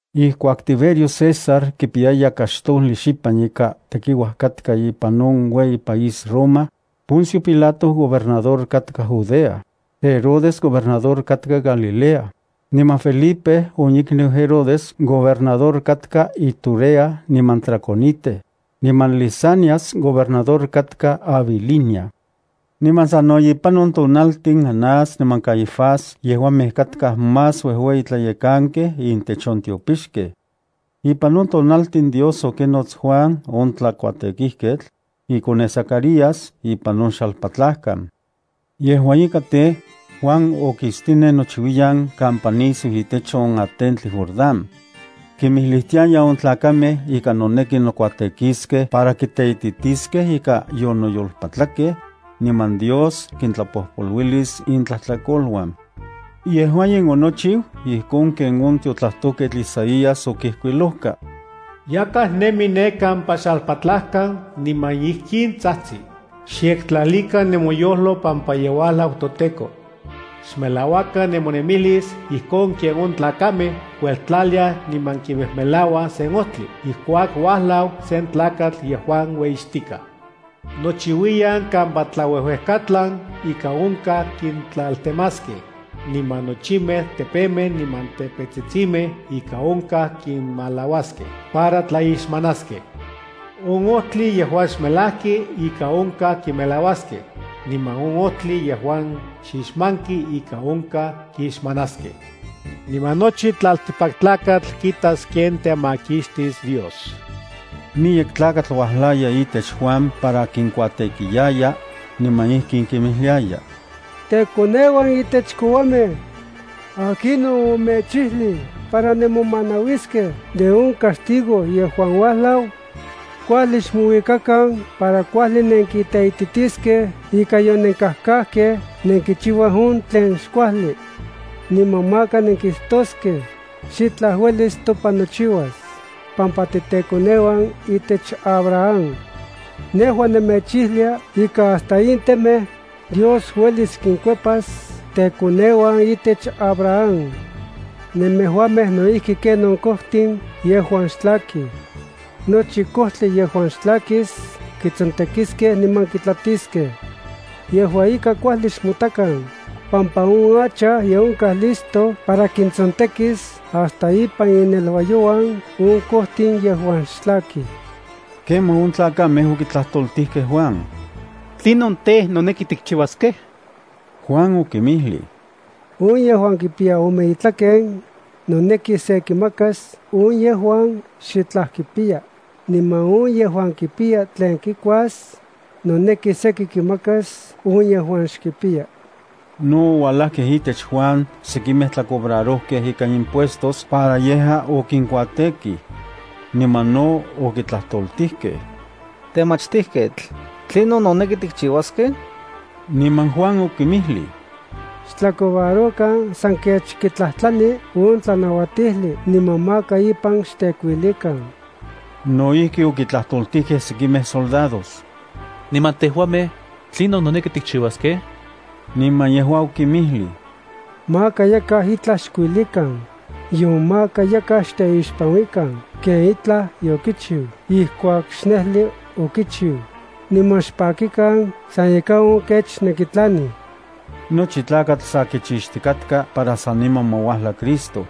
Ijkuak Tiberio César kipiyaya kaxtojli xipan ika tekiuaj katka ipan on ueyi país Roma, Poncio Pilato gobernador katka Judea, Herodes gobernador katka Galilea, niman Felipe on ikniu Herodes gobernador katka Iturea niman Traconite, niman Lisanias gobernador katka Abilinia. Niman sano ipan on tonaltin Anás niman Caifás yejuamej katkaj más uejueyitlayekankej intech on tiopixkej. Ipan on tonaltin Dios okinots Juan on tlakuatekijketl, ikoneu Zacarías ipan on xalpatlajkan. Yejua ika tej, Juan okistinen nochiuiyan kampa nisiu itech on atentli Jordán. Kimijlijtiaya on tlakamej ika noneki nokuatekiskej para kiteititiskej ika yonoyolpatlakej, niman Dios kintlapojpoluilis intlajtlakoluan. Yejua in onochiu ijkon ken on tiotlajtojketl Isaías okijkuilojka: Yakaj nemi ne kampa xalpatlajkan niman ijkin tsajtsi: “Xyektlalikan nemoyojlo pampa ye uajlau toTEKO. Xmelauakan nemonemilis ijkon ken on tlakamej kueltlaliaj, niman kimejmelauaj sen ojtli ijkuak uajlau sen tlakatl yejuan ueyixtikaj. Nochiuiyan kampa tlauejuejkatlan ika onkaj kintlaltemaskej, niman nochimej tepemej niman tepetsitsimej ika onkaj kinmalauaskej para tlaixmanaskej. On ojtli yejuan xmelajki ika onkaj kimelauaskej, niman on ojtli yejuan xixmanki ika onkaj kixmanaskej. Niman nochi tlaltikpaktlakatl kitas ken temakixtis Dios.” Miyek tlakatl uajlaya itech Juan para kinkuatekiyaya, niman ijkin kinmijliaya: —¡Tekoneuan intech kouamej! ¿Akinon omechijlij para nenmomanauiskej de on castigo yejuan uajlau? Kuajli xmouikakan para kuajli nenkiteititiskej ika yonenkajkajkej nenkichiuaj on tlen xkuajli. Niman maka nenkijtoskej: “Xitlaj uelis topan nochiuas, pampa titekoneuan itech Abraham.” Nejua nemechijlia ika hasta in temej Dios uelis kinkuepas tekoneuan itech Abraham. Nemejuamej no ijki ken on kojtin yejuan xtlakij. Nochi kojtli yejuan xtlakis kitsontekiskej niman kitlatiskej. Yejua ika kuajli xmotakan, pampa on hacha ye onkaj listo para kintsontekis hasta ipan ineluayouan on kojtin yejuan xtlakij. Kemaj on tlakamej okitlajtoltijkej Juan: —¿Tlinon tej, noneki tikchiuaskej? Juan okinmijlij: —On yejuan kipiya ome itlaken, noneki se kimakas on yejuan xitlaj kipiya, niman on yejuan kipiya tlen kikuas, noneki seki kimakas on yejuan xkipiya. No oualajkej itech Juan sekimej tlacobrarojkej ikan impuestos para yejua okinkuatekij. Niman no okitlajtoltijkej: —Temachtijketl, ¿tlinon noneki tikchiuaskej? Niman Juan okinmijlij: —Xtlacobrarokan san kech kitlajtlani on tlanauatijli niman maka ipan xtekuilikan. No ijki okitlajtoltijkej sekimej soldados: —Niman tejuamej, ¿tlinon noneki tikchiuaskej? Niman yejua okinmijlij: —Maka yakaj itlaj xkuilikan, nion maka yakaj xteixpanuikan ken itlaj yokichiu ijkuak xnejli okichiu, niman xpakikan san ikan on kech nenkitlanij. Nochi tlakatl sa kichixtikatka para saniman ma uajla Cristo.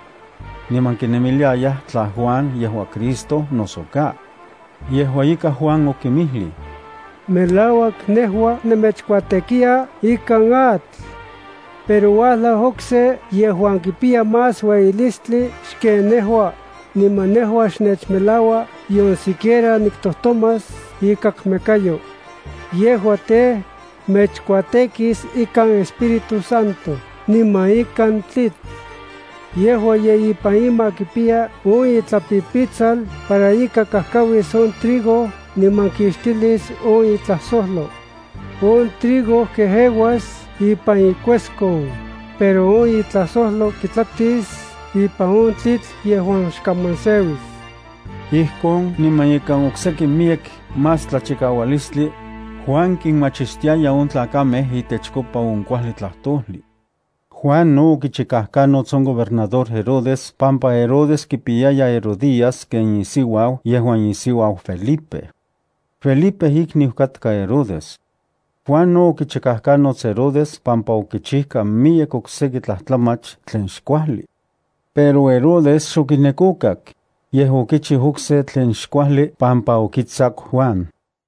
Niman kinemiliayaj tla Juan yejua Cristo noso ka. Yejua ika Juan okinmijlij: —Melauak nejua nemechkuatekiya ikan atl. Pero uajlau okse yejuan kipiya más ueyitilistli xken nejua, niman nejua xnechmelaua nion siquiera niktojtomas ikakmekayo. Yejua tej, mechkuatekis ikan Espíritu Santo niman ikan tlitl. Yejua ye ipan ima kipiya on itlapipitsal para ika kajkauis on trigo niman kixtilis on itlajsojlo. On trigo kejeuas ipan ikueskon, pero on itlajsojlo kitlatis ipan on tlitl yejuan xkaman seuis. Ijkon, niman ikan okseki miyek más tlachikaualistli, Juan kinmachistiaya on tlakamej itechkopa on kuajli tlajtojli. Juan no okichikajkanots on gobernador Herodes pampa Herodes kipiyaya Herodías ken isiuau yejuan isiuau Felipe. Felipe ikniu katka Herodes. Juan no okichikajkanots Herodes pampa okichijka miyek okseki tlajtlamach tlen xkuajli. Pero Herodes xokinek okak, yej okichiu okse tlen xkuajli pampa okitsaku Juan.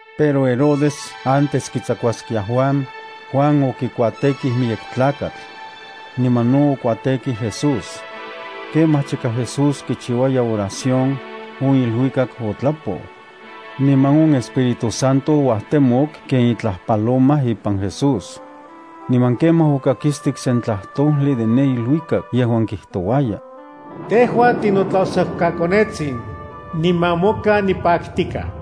Pero Herodes antes kitsakuaskia Juan, Juan okikuatekij miyek tlakatl. Niman no okuatekij Jesús. Kemaj chika Jesús kichiuaya oración, on iluikak otlapou, niman on Espíritu Santo ouajtemok ken itlaj paloma ipan Jesús. Niman kemaj okakistik sen tlajtojli de ne iluikak yejuan kijtouaya: —Tejua tinotlajsojkaKonetsin, niman moka nipaktikaj.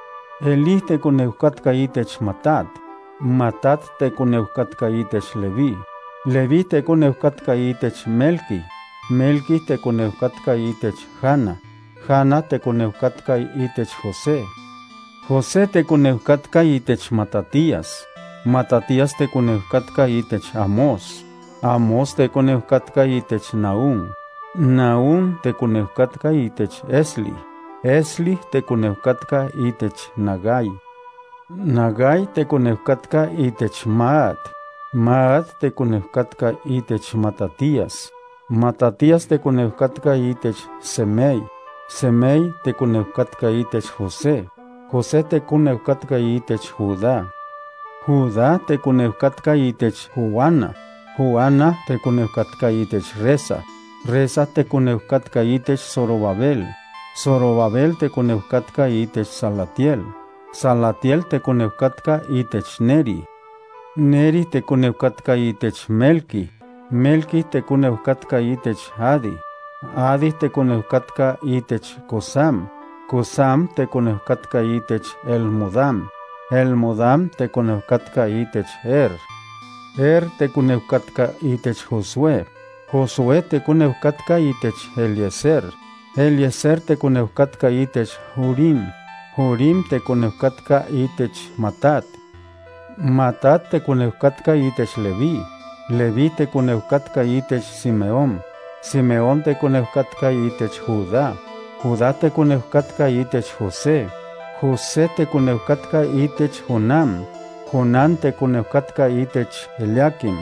Elí tekoneu katka itech Matat, Matat tekoneu katka itech Leví, Leví tekoneu katka itech Melqui, Melqui tekoneu katka itech Jana, Jana tekoneu katka itech José, José tekoneu katka itech Matatías, Matatías tekoneu katka itech Amós, Amós tekoneu katka itech Nahúm, Nahúm tekoneu katka itech Esli, Esli, tekoneu katka itech Nagai, Nagai tekoneu katka itech Maat, Maat tekoneu katka itech Matatías, Matatías tekoneu katka itech Semei, Semei tekoneu katka itech José, José tekoneu katka itech Judá, Judá tekoneu katka itech Joana, Joana tekoneu katka itech Resa, Resa tekoneu katka itech Zorobabel, Zorobabel tekoneu katka itech Salatiel, Salatiel tekoneu kakta itech Neri, Neri tekoneu katka itech Melqui, Melqui tekoneu katka itech Adi, Adi tekoneu katka itech Cosam, Cosam tekoneu katka itech Elmodam, Elmodam tekoneu katka itech Er, Er tekoneu katka itech Josué, Josué tekoneu katka itech Eliezer, Eliezer tekoneu katka itech Jorim, Jorim tekoneu katka itech Matat, Matat tekoneu katka itech Leví, Leví tekoneu katka itech Simeón, Simeón tekoneu katka itech Judá, Judá tekoneu katka itech José, José tekoneu katka itech Jonán, Jonán tekoneu katka itech Eliaquim,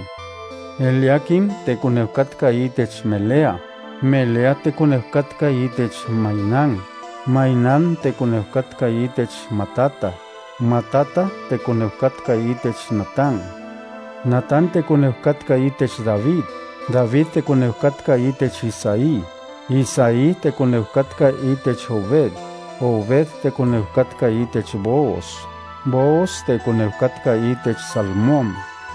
Eliaquim tekoneu katka itech Melea, Melea tekoneu katka itech Mainán, Mainán tekoneu katka itech Matata, Matata tekoneu katka itech Natán, Natán tekoneu katka itech David, David tekoneu katka itech Isaí, Isaí tekoneu katka itech Obed, Obed tekoneu katka itech Booz, Booz tekoneu katka itech Salmón,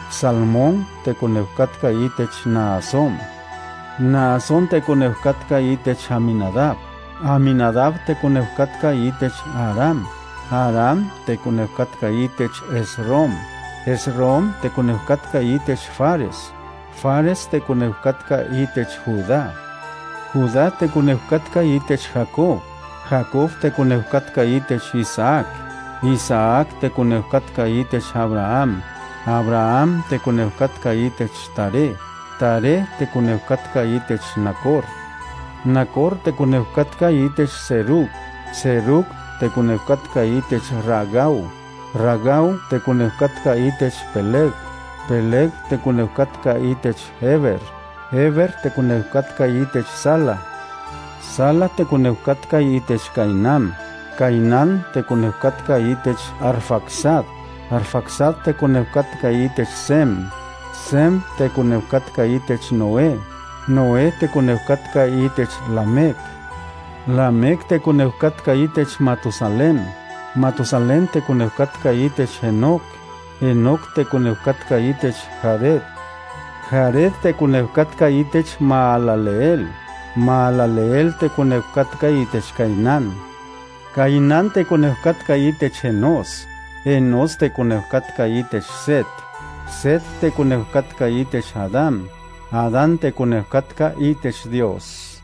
Salmón tekoneu katka itech Naasón, Naasón tekoneu katka itech Aminadab, Aminadab tekoneu katka itech Aram, Aram tekoneu katka itech Esrom, Esrom tekoneu katka itech Fares, Fares tekoneu katka itech Judá, Judá tekoneu katka itech Jacob, Jacob tekoneu katka itech Isaac, Isaac tekoneu katka itech Abraham, Abraham tekoneu katka itech Taré, Taré tekoneu katka itech Nacor, Nacor tekoneu katka itech Serug, Serug tekoneu katka itech Ragau, Ragau tekoneu katka itech Peleg, Peleg tekoneu katka itech Heber, Heber tekoneu katka itech Sala, Sala tekoneu katka itech Cainán, Cainán tekoneu katka itech Arfaxad, Arfaxad tekoneu katka itech Sem, Sem tekoneu katka itech Noé, Noé tekoneu katka itech Lamec, Lamec tekoneu katka itech Matusalén, Matusalén tekoneu katka itech Enoc, Enoc tekoneu katka itech Jared, Jared tekoneu katka itech Mahalaleel, Mahalaleel tekoneu katka itech Cainán, Cainán tekoneu katka itech Enós, Enós tekoneu katka itech Set, Set tekoneu katka itech Adán, Adán tekoneu katka itech Dios.